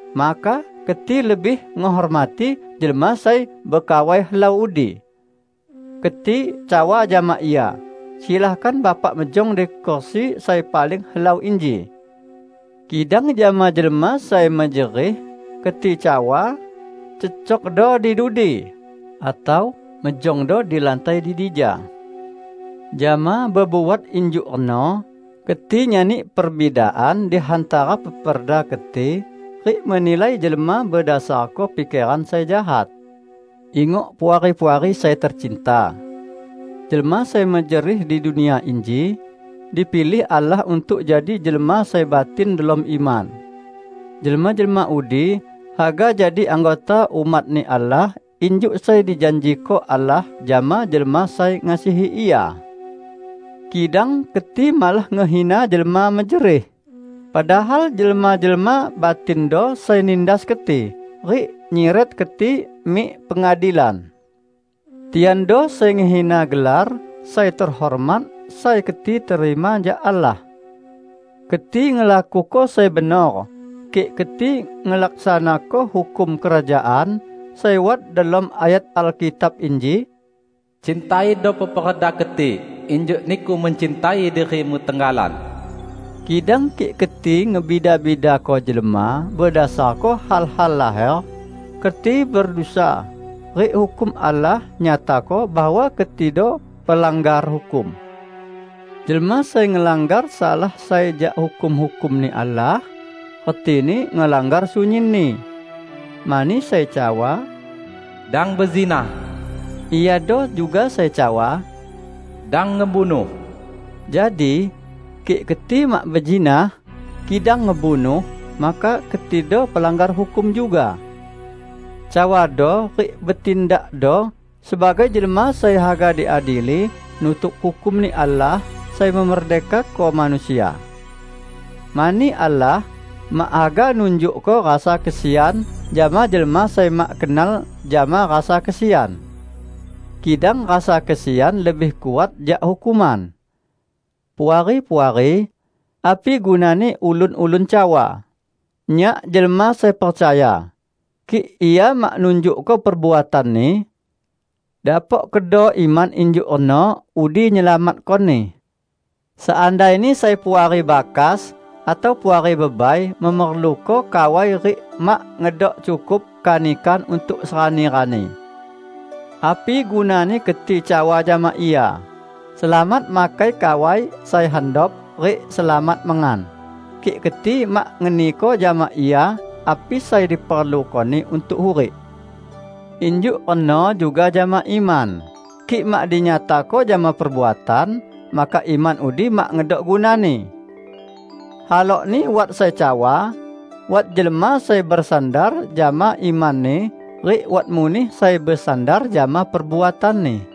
maka keti lebih ngehormati jelma sai bekawai helau udi. Keti cawa jama ia, "Silakan Bapak mejong di kursi sai paling helau inji." Kidang jama jelma sai mejerih keti cawa, "Cecokdo di dudi," atau "Mejongdo di lantai di dija." Jama bebuat injuk reno, keti nyani perbidaan di hantara peperda keti rik menilai jelma bedasarko pikeran sai jahat. Ingok, Puari-puari sai tecinta! Jelma sai mejerih di dunia inji, dipilih Allah untuk jadi jelma sai batin delom iman. Jelma-jelma udi haga jadi anggota umat-Ni Allah injuk sai dijanjiko Allah jama jelma sai ngasihi Ia. Kidang keti malah ngehina jelma mejerih, padahal jelma-jelma batindo sai nindas keti rik nyiret keti mik pengadilan. Tiando sai ngehina gelar sai tehormat sai keti terima jak Allah! Keti ngelakuko sai benor, kik keti ngelaksanako hukum Kerajaan sai wat delom ayat Alkitab inji, "Cintaido peperda keti injuk niku mencintai dirimu tenggalan." Kidang kik keti ngebida-bidako jelma bedasarko hal-hal laher, keti bedusa, rik hukum Allah nyatako bahwa ketido pelanggar hukum. Jelma sai ngelanggar salah sai jak hukum-hukum-Ni Allah, retini ngelanggar sunyinni. Mani sai cawa, "Dang bezinah," iado juga sai cawa "Dang ngebunuh." Jadi, kik keti mak bezinah, kidang ngebunuh, maka ketido pelanggar hukum juga. Cawado rik betindakdo sebagai jelma sai haga diadili nutuk hukum-Ni Allah sai memerdekako manusia. Mani Allah mak haga nunjukko rasa kesian jama jelma sai mak kenal jama rasa kesian. Kidang rasa kesian lebih kuat jak hukuman! Puari-puari! Api gunani ulun-ulun cawa, "Nyak jelma sai percaya", kik ia mak nunjukko perbuatanni? Dapok kedo iman injuk reno udi nyelamatkoni? Seandaini sai puari bakas atau puari bebai memerluko kawai rik mak ngedok cukup kanikan untuk serani-rani. Api gunani keti cawa jama ia, "Selamat makai kawai sai handop rik selamat mengan!" -- kik keti mak ngeniko jama ia api sai diperlukoni untuk hurik? Injuk reno juga jama iman, kik mak dinyatako jama perbuatan, maka iman udi mak ngedok gunani. Halokni wat sai cawa, "Wat jelma sai besandar jama imanni rik wat muneh sai besandar jama perbuatanni."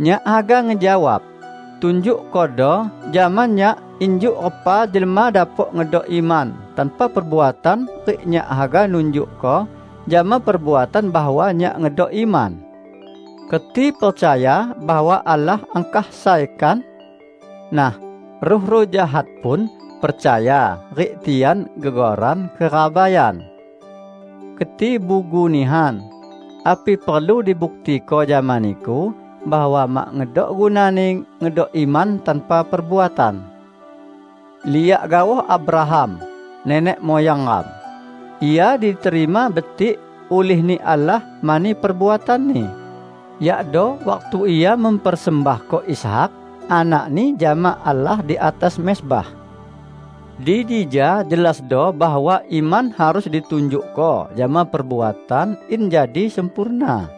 Nyak haga ngejawab, "Tunjukkodo jama nyak injuk repa jelma dapok ngedok iman tanpa perbuatan rik nyak haga nunjukko jama perbuatan bahwa nyak ngedok iman." Keti percaya bahwa Allah angkah sai, kan? Nah, ruh-ruh jahat pun percaya rik tian gegoran kerabaian! Keti bugu nihan! Api perlu dibuktiko jama niku bahwa mak ngedok gunani ngedok iman tanpa perbuatan? Liak gaoh Abraham nenek muyang ram. Ia diterima betik ulih-Ni Allah mani perbuatanni, yakdo waktu ia mempersembahko Ishak, anakni, jama Allah di atas mezbah. Di dija jelasdo bahwa iman harus ditunjukko jama perbuatan in jadi sempurna.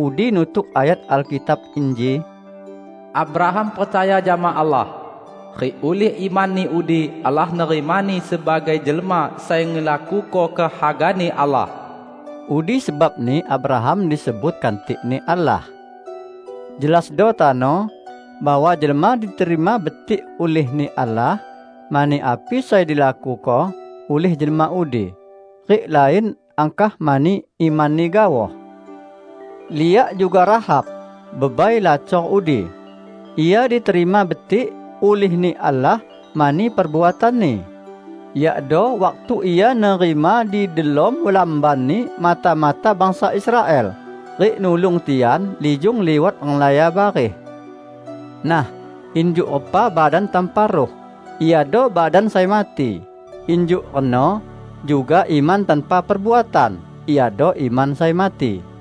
Udi nutuk ayat Alkitab inji, "Abraham percaya jama Allah, rik ulih imanni udi Allah nerimani sebagai jelma sai ngelakuko kehaga-Ni Allah." Udi sebabni Abraham disebut, "Kantik-Ni Allah." Jelasdo tano, bahwa jelma diterima betik ulih-Ni Allah mani api sai dilakuko ulih jelma udi, rik lain angkah mani imanni gaoh. Liak juga Rahab, bebai lacor udi. Ia diterima betik ulih-Ni Allah mani perbuatanni, yakdo waktu ia nerima di delom lambanni mata-mata bangsa Israel rik nulung tian lijung liwat renglaya bareh. Nah, injuk repa badan tanpa ruh iado badan sai mati, injuk reno juga iman tanpa perbuatan iado iman sai mati.